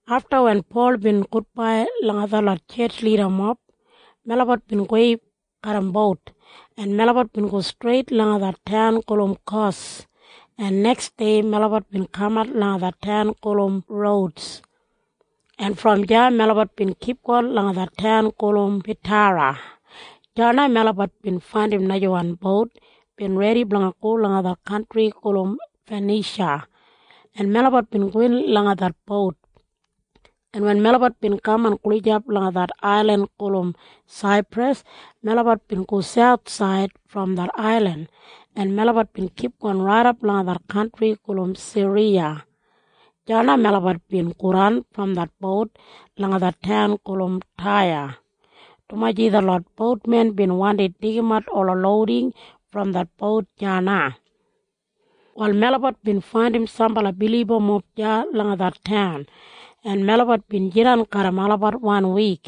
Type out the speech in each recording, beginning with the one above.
Afta wen Pol bin gudbai langa detlot tjetj lidamob, melabat bin gowei garram bout, en melabat bin go streit langa det taun gulum Kos, en neksdei melabat bin kamat langa det taun gulum Rouds, en brom deya melabat bin kipgon langa det taun gulum Petara. Deya na melabat bin faindim najawan bout bin redi blanga go langa det kantri gulum Fanisha, en melabat bin gowin langa det bout, en wen melabat bin kaman gulijap langa det ailin gulum Saipras, melabat bin go sauthsaid brom det ailin, en melabat bin kipgon raidap langa det kantri gulum Siriya. Deya na melabat bin godan brom det bout langa det taun gulum Taya, dumaji detlot boutmen bin wandi deigimat ola louding brom det bout deya na. Wal melabat bin faindim sambala bilibamob deya langa det taun, en melabat bin jidan garram olabat wanwik,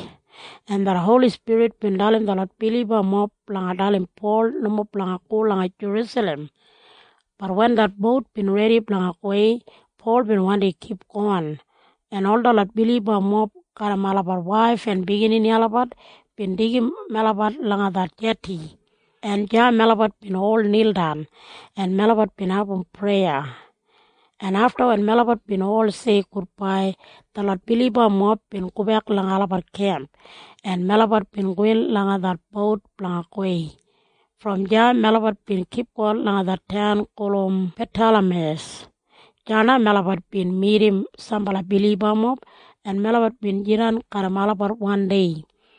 en det Holi Spirit bin dalim detlot bilibamob blanga dalim Pol nomo blanga go langa Jerusalem. Bat wen det bout bin redi blanga gowei, Pol bin wandi kipgon, en ol detlot bilibamob garram olabat waif en biginini olabat bin deigim melabat langa det jeti, en deya melabat bin ol nildan, en melabat bin abum preya, en afta wen melabat bin ol tok gudbai, detlot bilibamob bin gobek langa olabat kemp, en melabat bin gowin langa det bout blanga gowei. Brom deya melabat bin kipgon langa det taun gulum Patalameiyas. Deya na melabat bin midim sambala bilibamob, en melabat bin jidan garram olabat oni wan dei.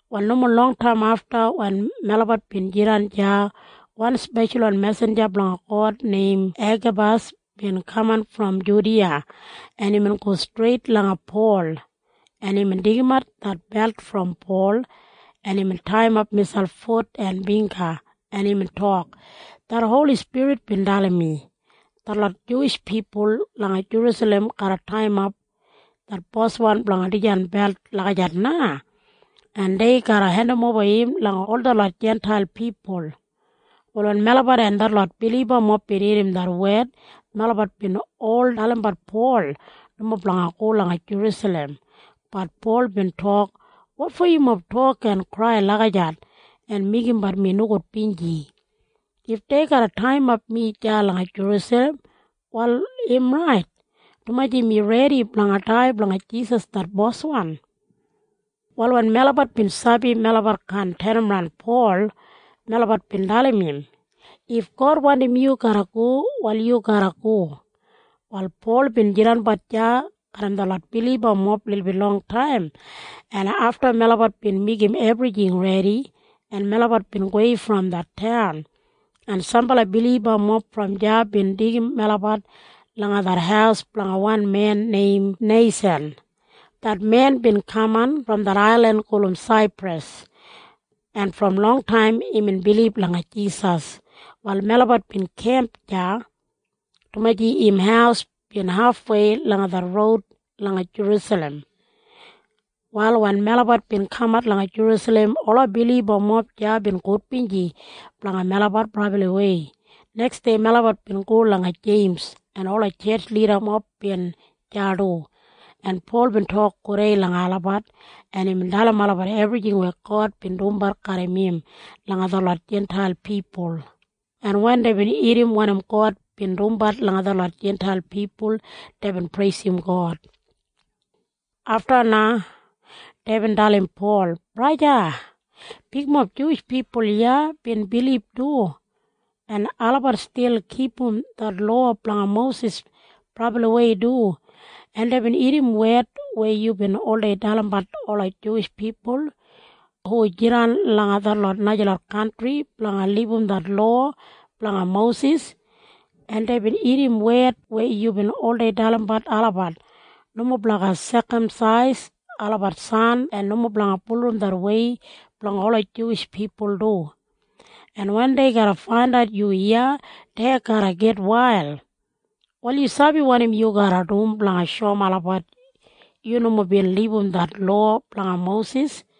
Wal nomo longtaim afta wen melabat bin jidan deya, wan speshalwan mesinja blanga God neim Egabas bin kaman brom Judiya. En imbin go streit langa Pol, en imbin deigimat det belt brom Pol, en imbin taiyimap miselp fut en bingga, en imbin tok, “Det Holi Spirit bin dalim mi, detlot Juwish pipul langa Jerusalem garra taiyimap det boswan blanga dijan belt lagijat na, en dei garra hendimoba im langa detlot Jintail pipul.” Wal wen melabat en detlot bilibamob bin irrim det wed, melabat bin ol dalimbat Pol nomo blanga go langa Jerusalem. Bat Pol bin tok, “Wotfo yumob tok en krai lagijat en meigimbat mi nogudbinji? If dei garra taiyimap mi deya langa Jerusalem, wal im rait, dumaji mi redi blanga dai blanga Jisas det Boswan.” Wal wen melabat bin sabi melabat kaan tenimran Pol, melabat bin dalim im, “If God wandim yu blanga go, wal yu garra go.” Wal Pol bin jidanbat deya garram detlot bilibamob lilbit longtaim, en afta melabat bin meigim ebrijing redi, en melabat bin gowei brom det taun, en sambala bilibamob brom deya bin deigim melabat langa det haus blanga wan men neim Neisan. Det men bin kaman brom det ailin gulum Saipras, en brom longtaim imbin bilib langa Jisas. Wal melabat bin kemp deya, dumaji im haus bin hafwei langa det roud langa Jerusalem. Wal wen melabat bin kamat langa Jerusalem, ola bilibamob deya bin gudbinji blanga melabat brabliwei. Neksdei melabat bin go langa Jeims, en ola tjetj lidamob bin deya du. En Pol bin tok gudei langa olabat, en imbin dalim olabat ebrijing weya God bin dumbat garram im langa detlot Jintail pipul, en wen deibin irrim wanim God bin dumbat langa detlot Jintail pipul, deibin preisim God. Afta na deibin dalim Pol, “Braja, bigmob Juwish pipul iya bin bilib du, en olabat stil kipum det lowa blanga Mosis brabliwei du. En deibin irrim wed weya yubin oldei dalimbat ola Juwish pipul hu jidan langa detlot najalot kantri blanga libum det lowa blanga Mosis, en deibin irrim wed weya yubin oldei dalimbat olabat nomo blanga sekamsais olabat san en nomo blanga bulurrum det wei blanga ola Juwish pipul du, en wen dei garra faindat yu iya, dei garra gitwail. “Wal yu sabi wanim yu garra dum blanga shoum olabat yu nomo bin libum det lowa blanga Mosis?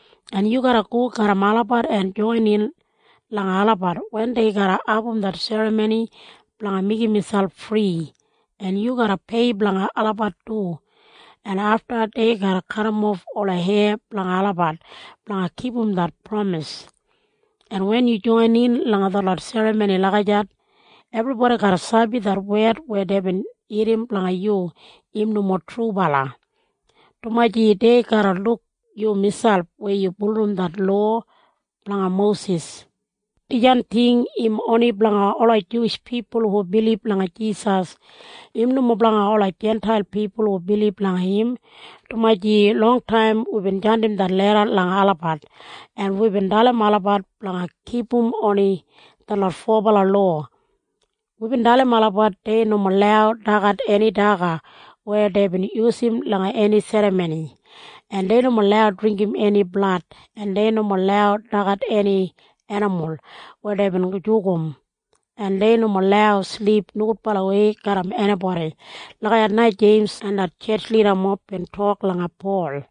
en yu garra go garram olabat en joinin langa olabat wen dei garra abum det serramoni blanga meigim miselp fri, en yu garra pei blanga olabat du, en afta dei garra kadimof ola heya blanga olabat blanga kipum det pramis. En wen yu joinin langa det serramoni lagijat, ebribodi garra sabi det wed weya deibin irrim blanga yu im nomo trubala, dumaji dei garra luk yu miselp weya yu bulurrum det lowa blanga Mosis. Dijan ting im oni blanga ola Juwish pipul hu bilib langa Jisas. Im nomo blanga ola Jintail pipul hu bilib langa im, dumaji longtaim wibin jandim det leda langa olabat, en wibin dalim olabat blanga kipum oni detlot fobala lowa. Wibin dalim olabat dei nomo lau dagat eni daga weya deibin yusum langa eni serramoni, en dei nomo lau dringgim eni blad, en dei nomo lau dagat eni enimul weya deibin jugum, en dei nomo lau silip nogudbalawei garram enibodi.” Lagijat na Jeims en det tjetj lidamob bin tok langa Pol.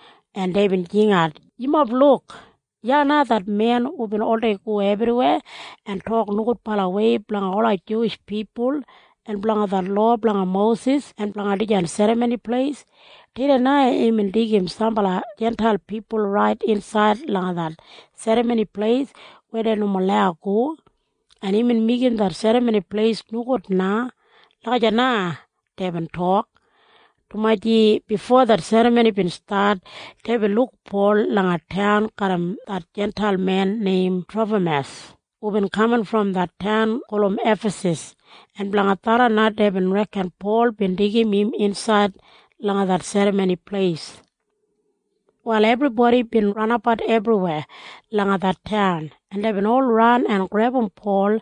en deibin jingat, “Yumob luk! Iya na det men hubin oldei go ebriweya en tok nogudbalawei blanga ola Juwish pipul en blanga det lowa blanga Mosis en blanga dijan Serramoni Pleis. Tudei na imbin deigim sambala Jintail pipul rait insaid langa det Serramoni Pleis weya dei nomo lau go, en imbin meigim det Serramoni Pleis nogud na.” Lagijat na deibin tok, dumaji bifo det serramoni bin stat, deibin luk Pol langa taun garram det Jintail men neim Trofamas hubin kaman brom det taun gulum Efasas, en blanga tharran na deibin reken Pol bin deigim im insaid langa det Serramoni Pleis. Wal ebribodi bin ranabat ebriweya langa det taun, en deibin ol ran en grebum Pol,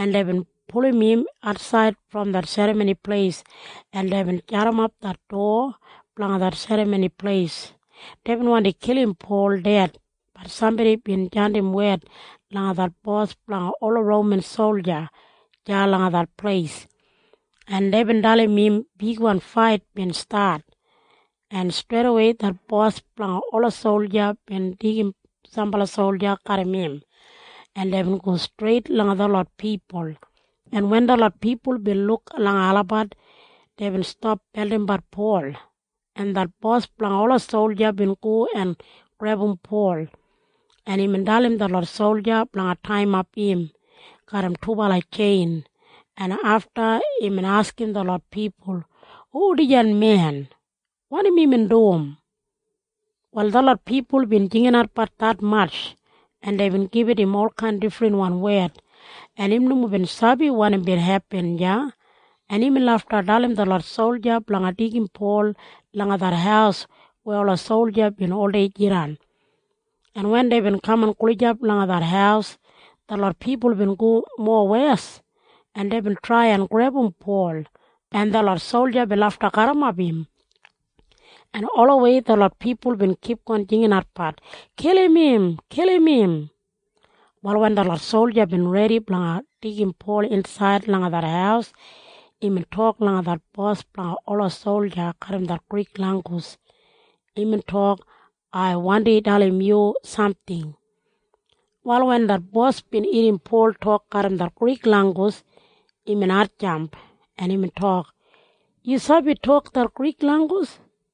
en deibin pulum im atsaid brom det Serramoni Pleis, en deibin jadimap det dowa blanga det Serramoni Pleis. Deibin wandi kilim Pol ded. Bat sambodi bin jandim wed langa det bos blanga ola Roman solja deya langa det pleis, en deibin dalim im bigwan fait bin stat, en streidawei det bos blanga ola solja bin deigim sambala solja garram im, en deibin go streit langa detlot pipul, en wen detlot pipul bin luk langa olabat, deibin stap beldimbat Pol, en det bos blanga ola solja bin go en grebum Pol, en imbin dalim detlot solja blanga taiyimap im garram dubala tjein, en afta imbin askim detlot pipul, “Hu dijan men? Wanim imbin dum?” Wal detlot pipul bin jinginatbat detmatj, en deibin gibit im olkain difrinwan wed, en im nomo bin sabi wanim bin hepin deya, en imbin lafta dalim detlot solja blanga deigim Pol langa det haus weya ola solja bin oldei jidan, en wen deibin kaman gulijap langa det haus, detlot pipul bin go mowes, en deibin trai en grebum Pol, en detlot solja bin lafta garrimap im, en olawei detlot pipul bin kipgon jinginatbat, “Kilim im! Kilim im!” Wal wen detlot solja bin redi blanga deigim Pol insaid langa det haus, imbin tok langa det bos blanga ola solja garram det Grik langgus. Imbin tok, “Ai gin dalim yu samting.” Wal wen det bos bin irrim Pol tok garram det Grik langgus, imbin hatjamp, en imbin tok, “Yu sabi tok det Grik langgus?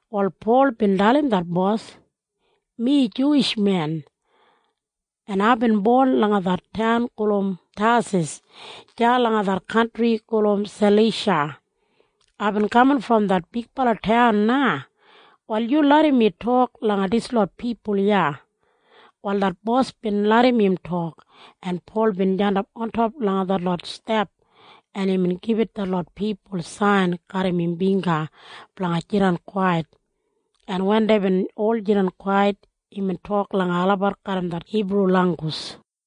Wal Pol bin dalim det bos, “Mi Juwish men, en aibin bon langa det taun gulum Tasas deya langa det kantri gulum Salisha. Aibin kaman brom det bigbala taun na. Wal yu larram mi tok langa dislot pipul iya.” Wal det bos bin larram im tok, en Pol bin jandap ontop langa detlot step, en imbin gibit detlot pipul sain garram im bingga blanga jidan kwait, en wen deibin ol jidan kwait, imbin tok langa olabat garram det Hibru langgus.